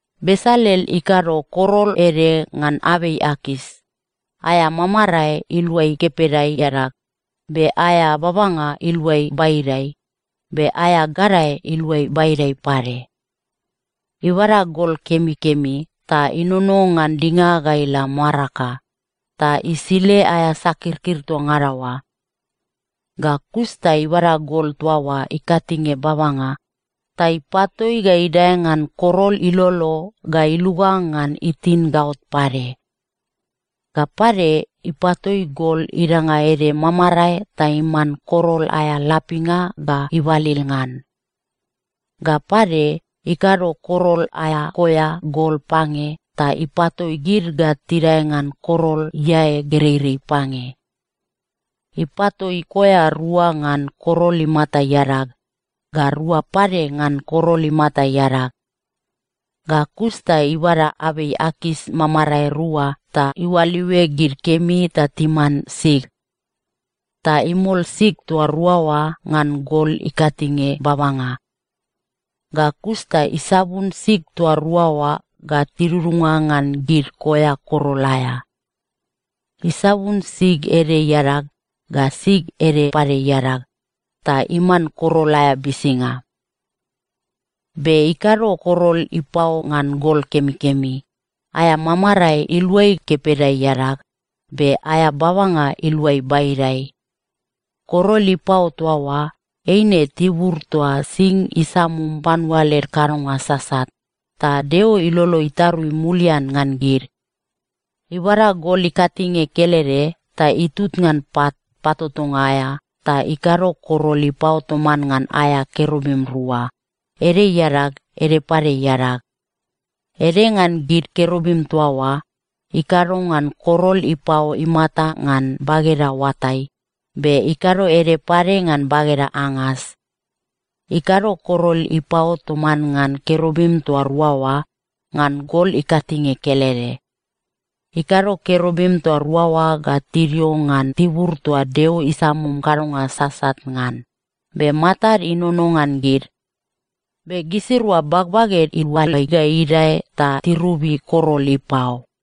Besalel ikado korol ede ngan abei akas, aea mamarae iluai kepeda iadag, be aea babanga iluai baidai, be aea gadae iluai baidai pade. Ibada gol kemikemi ta inono ngan dinga ga ila maraka, ta isile aea sakirkir toa ngada oa. Ga kus ta ibada gol toa oa ikatinge babanga, ta ipatoi ga idae ngan korol ilolo ga iluga ngan itin gaot pade. Ga pade, ipatoi gol idanga ede mamarae ta iman korol aea lapinga ga ibalil ngan. Ga pade, ikado korol aea koea gol pange ta ipatoi gid ga tidae ngan korol iae gereirei pange. Ipatoi koea rua ngan korol imata iadag, ga rua pade ngan korol imata iadag. Ga kus ta ibada abei akas mamarae rua ta iualiue gid kemi ta timan sig. Ta imol sig toa rua oa ngan gol ikatinge babanga. Ga kus ta isabun sig toa rua oa ga tidudunga ngan gid koea korol aea. Isabun sig ede iadag, ga sig ede pade iadag, ta iman korol aea bisinga. Be ikado korol ipao ngan gol kemikemi, aea mamarae iluai kepeda iadag, be aea babanga iluai baidai. Korol ipao toa oa, eine tibur toa sing isamum panua led kadonga sasat, ta Deo ilolo itarui mulian ngan gid. Ibada gol ikatinge kelede ta itut ngan pat patotonga aea ta ikado korol ipao toman ngan aea kerubim rua, ede iadag, ede pade iadag. Ede ngan gid kerubim toa oa, ikado ngan korol ipao imata ngan bageda oatai, be ikado ede pade ngan bageda angas. Ikado korol ipao toman ngan kerubim toa rua oa ngan gol ikatinge kelede. Ikado kerubim toa rua oa ga tidio ngan tibur toa Deo isamum kadonga sasat ngan, be matad inono ngan gid. Be gisirua bagbaged iualai ga idae ta tirobi korol ipao.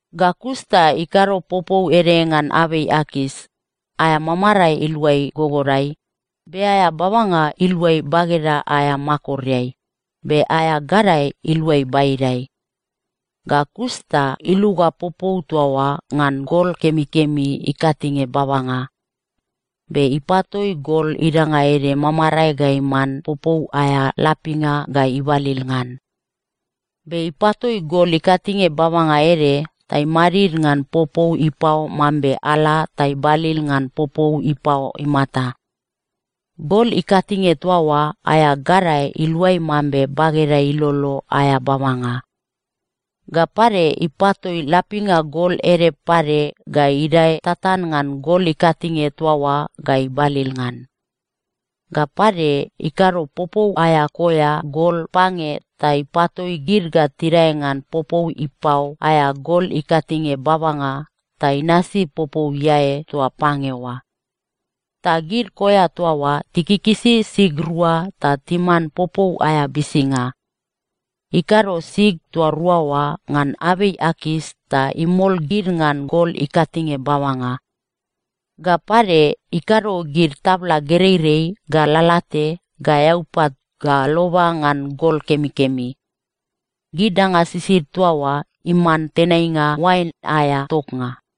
Ga kus ta ikado popou ede ngan abei akas, aea mamarae iluai gogodai, be aea babanga iluai bageda aea makoreai, be aea gadae iluai baidai. Ga kus ta iluga popou toa oa ngan gol kemikemi ikatinge babanga. Be ipatoi gol idanga ede mamarae ga iman popou aea lapinga ga ibalil ngan. Be ipatoi gol ikatinge babanga ede ta imadid ngan popou ipao mambe ala ta ibalil ngan popou ipao imata. Gol ikatinge toa oa aea gadae iluai mambe bageda ilolo aea babanga. Ga pade, ipatoi lapinga gol ede pade ga idae tatan ngan gol ikatinge toa oa ga ibalil ngan. Ga pade, ikado popou aea koea gol pange ta ipatoi gid ga tidae ngan popou ipao aea gol ikatinge babanga ta inasi popou iae toa pange oa. Ta gid koea toa oa tikikisi sig rua ta timan popou aea bisinga. Ikado sig toa rua oa ngan abei akas ta imol gid ngan gol ikatinge babanga. Ga pade, ikado gid tabla gereirei ga lalate ga eaupat ga loba ngan gol kemikemi. Gid danga sisid toa oa iman tenainga oain aea toknga.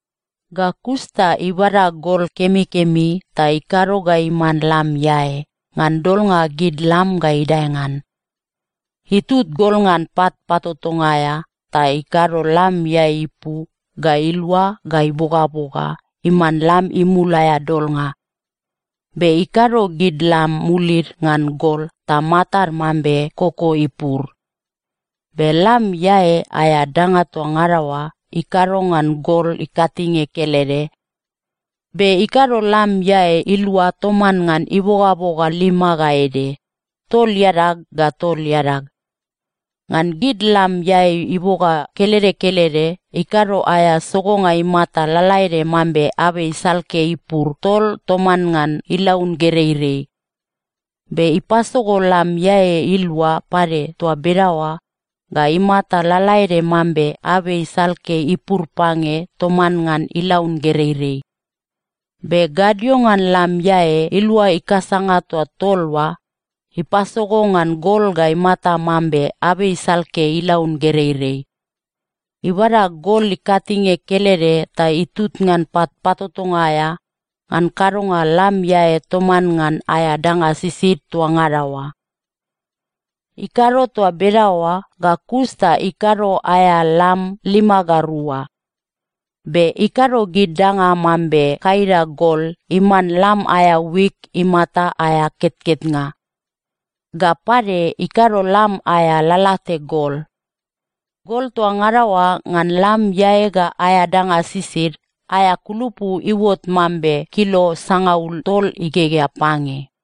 Ga kus ta ibada gol kemikemi ta ikado ga iman lam iae, ngan dolnga gid lam ga idae ngan. Itut gol ngan pat patotonga aea ta ikado lam iae ipu ga ilua ga ibogaboga iman lam imul aea dolnga. Be ikado gid lam mulid ngan gol ta matad mambe koko ipur. Be lam iae aea danga toa ngada oa, ikado ngan gol ikatinge kelede. Be ikado lam iae ilua toman ngan ibogaboga lima ga ede, tol iadag ga tol iadag. Ngan gid lam iae iboga kelede kelede, ikado aea sogonga imata lalaede mambe abei salke ipur tol toman ngan ilaun gereirei. Be ipasogo lam iae ilua pade toa bedaoa ga imata lalaede mambe abei salke ipur pange toman ngan ilaun gereirei. Be gadio ngan lam iae ilua ikasanga toa tol oa, ipasogo ngan gol ga imata mambe abei salke ilaun gereirei. Ibada gol ikatinge kelede ta itut ngan pat patotonga aea ngan kadonga lam iae toman ngan aea danga sisid toa ngada oa. Ikado toa bedaoa ga kus ta ikado aea lam lima ga rua. Be ikado gid danga mambe kaida gol iman lam aea wik imata aea ketketnga. Ga pade, ikado lam aea lalate gol. Gol toa ngada oa ngan lam iae ga aea danga sisid, aea kulupu iuot mambe kilo sangaul tol igegea pange.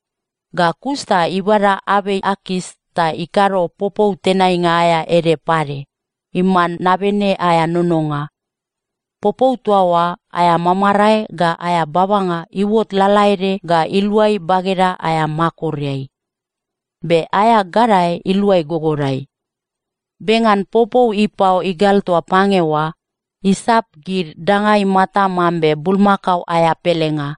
Ga kus ta ibada abei akas ta ikado popou tenainga aea ede pade, iman nabene aea nononga. Popou toa oa aea mamarae ga aea babanga iuot lalaede ga iluai bageda aea makoreai. Be aea gadae iluai gogodai. Be ngan popou ipao igal toa pange oa, isap gid danga imata mambe bulmakao aea pelenga.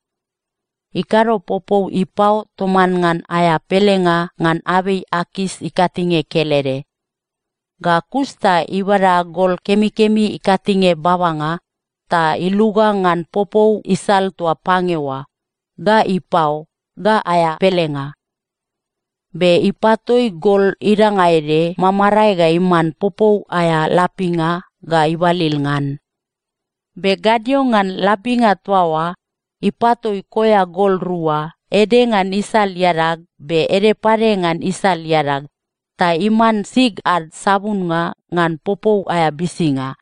Ikado popou ipao toman ngan aea pelenga ngan abei akas ikatinge kelede. Ga kus ta ibada gol kemikemi ikatinge babanga, ta iluga ngan popou isal toa pange oa, ga ipao, ga aea pelenga. Be ipatoi gol idanga ede mamarae ga iman popou aea lapinga ga ibalil ngan. Be gadio ngan lapinga toa oa, ipatoi koea gol rua, ede ngan isal iadag, be ede pade ngan isal iadag, ta iman sig ad sabunnga ngan popou aea bisinga.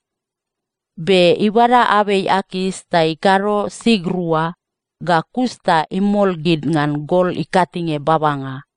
Be ibada abei akas, ta ikado sig rua, ga kus ta imol gid ngan gol ikatinge babanga.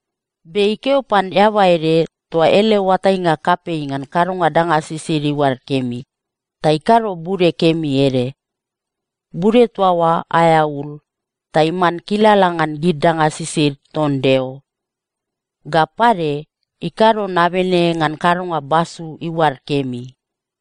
Be ikeo pan eaba ede toa ele oatainga kapei ngan kadonga danga sisid iuad kemi, ta ikado bude kemi ede. Bude toa oa aea ul, ta iman kilala ngan gid danga sisid ton Deo. Ga pade, ikado nabene ngan kadonga basu iuad kemi.